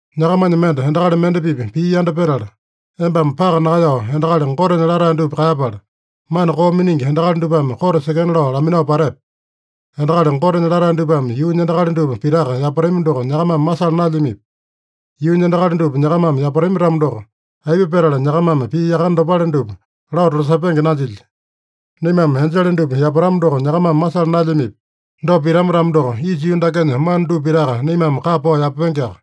Nyakamanya mende endakali mende-pipa pii yanda petala, embame paka nakaeyao endakali Gotenya latae dupa kaeyapala, mana koo miningi endakali dupame kote sekena lao laminao patepe? Endakali Gotenya latae dupame yuunya endakali dupa pitaka yapatami doko nyakamame masala naelyamipi? Yuunya endakali dupa nyakamame yapatami-tamo doko, aipa petala nyakamame pii yakane dopale dupa lao tolasepenge nanjilya? Naimame enjele dupa yapatama doko nyakamame masala naelyamipi? Dopa pitama-tamo doko, isa yuu dakenya mana dupa pitaka naimame kapa pao yapapengeaka.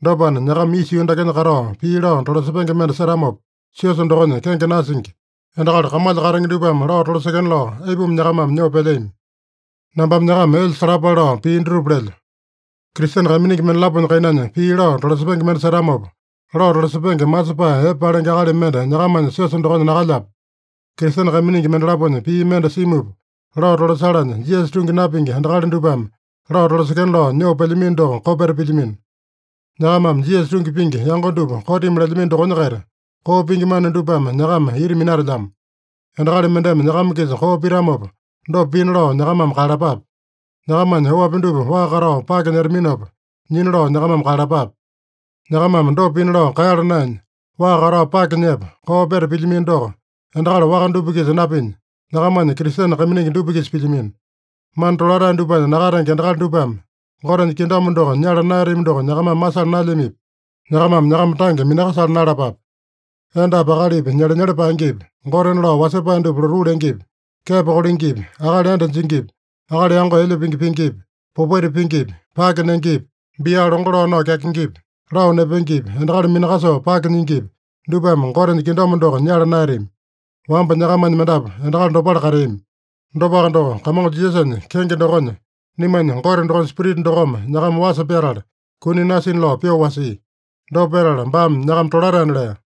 Dopana, nyakama isa yuu dakenya katao pii lao tolasepenge mende setamopa, siosa dokonya kenge nasingi, endakali kamalya katenge dupame lao tolasekena lao aipuma nyakamame nyoo pelyami? Nambame nyakama elya salapale lao pii dutupa lelyo. Kristene kaiminingi mendalaponya kainanya pii lao tolasepenge mende setamopa, lao tolasepenge masepae epe palenge akali mende nyakamanya siosa dokonya nakalyape? Kristene kaiminingi mendalaponya pii mende simupa lao tolasalanya, Jisasa tungi napingi endakali dupame lao tolasekena lao nyoo pelyamino doko kopeta pilyamino. Nyakamame Jisasa tungi pingi yango dupa kotimi lelyamino dokonya-kaita, koo pingi mana dupame nyakama ita minatelyamo. Endakali mendeme nyakama-kisa koo pitamopa, dopa pina lao nyakamame kaeyalapape. Nyakamanya oapi dupa waa katao pake nyetaminopa, nyina lao nyakamame kaeyalapape. Nyakamame dopa pina lao kaeyala naenya, waa katao pake nyepa, koo peta pilyamino doko, endakali waka dupa-kisa napinya, nyakamanya Kristene kaiminingi dupa-kisa pilyamino! Mana tolatae dupanya nakatenge endakali dupame Gotenya kingdom doko nyala naeyatami doko nyakamame masala naelyamipi? Nyakamame nyakama tange minakasala naeyalapape. Endapi akalipi nyelenyele paengepi, gotena lao wasepae dupa lotuu lengepi, kepo kolengepi, akali enda jingipi, akali yango elya pingi pingipi, popaita pingipi, pake nengepi, bia longo lao nao kyakengepi, lao nepengepi, endakali minakasoo pake nyingipi, dupame Gotenya kingdom doko nyala naeyatami. Wamba nyakamanya mendapu endakali dopale kateami. Dopaka doko, Kamongo Jisasanya kenge dokonya, naimanya Gote dokonya Spirita dokome nyakama wasa pyatala, kuni nasina lao pyoo wasia. Dopa petala baame nyakama tolataena lea.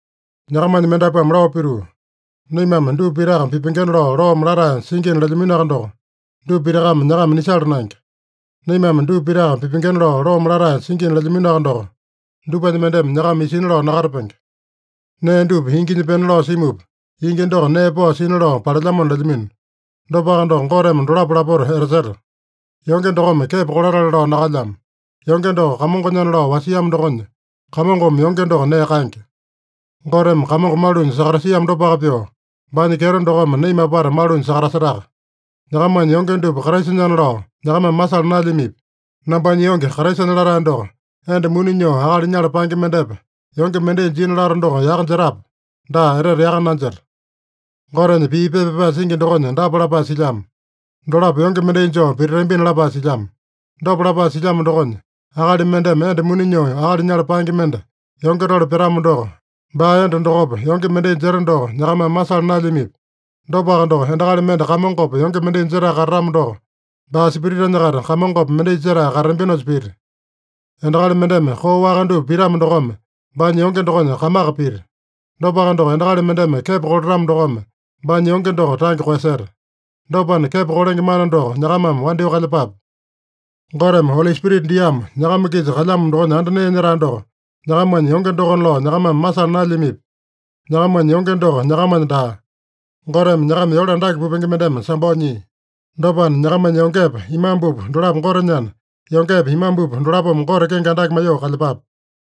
Nyakamanya mendapuame lao pituu, “Naimame dupa pitaka pipengena lao loome latae singina” lelyaminoaka doko, dupa pitakame nyakama nisala naenge. “Naimame dupa pitaka pipengena lao loome latae singina” lelyaminoaka doko, dupanya mendeme nyakama isina lao nakatapenge. “Nee dupa inginya pena lao simupa, ingi doko nee pao sina lao palelyamona” lelyamino. Dopaka doko, Goteme dolapo lapota etaseta. Yonge dokome kepo kolatale lao nakalyamo. Yonge doko Kamongonyana lao wasiamo dokonya, Kamongome yonge doko nee kaenge. Goteme Kamongo malunya sakatasiamo dopaka pyoo, baanya kyeto dokome naima apata malunya sakatasetaka. Nyakamanya yonge dupa Kraisanyana lao nyakamame masala naelyamipi? Nambanya yonge Kraisanya latae doko enda muni nyoo akali nyala paenge mendepa yonge mendai jina lato doko yaka jetape? Daa, etete yaka nanjeta! Gotenya pii pepa pyapae singi dokonya dapa lapae silyamo: “Dolapo yonge mendai joo pititambina” lapae silyamo. Dopa lapae silyamo dokonya, akali mendeme enda muni nyoo akali nyala paenge mende yonge tole pyatamo doko, baa enda dokopa yonge mendai jeta doko nyakamame masala naelyamipi? Dopaka doko, endakali mende Kamongopa yonge mendai jetae katatamo doko, baa spiritanya-kaita Kamongopa mendai jetae katatambinosa pita. Endakali mendeme koo waka dupa pitamo dokome, baanya yonge dokonya kamaka pita. Dopaka doko, endakali mendeme kepo kolatamo dokome, baanya yonge doko tange koeyaseta. Dopana, kepo kolenge mana doko nyakamame wandyoo kalyepape. Goteme Oli Spirita diamo, nyakama-kisa kalyamo dokonya anda nee nyetae doko, nyakamanya yonge dokona lao nyakamame masala naelyamipi? Nyakamanya yonge doko nyakamanya daa. Goteme nyakama yole andake pupenge mendeme sambao nyia. Dopana, nyakamanya yongepa imambupa dolapo Gotenyana, yongepa imambupa dolapome Gote kenge andake maiyoo kalyepape.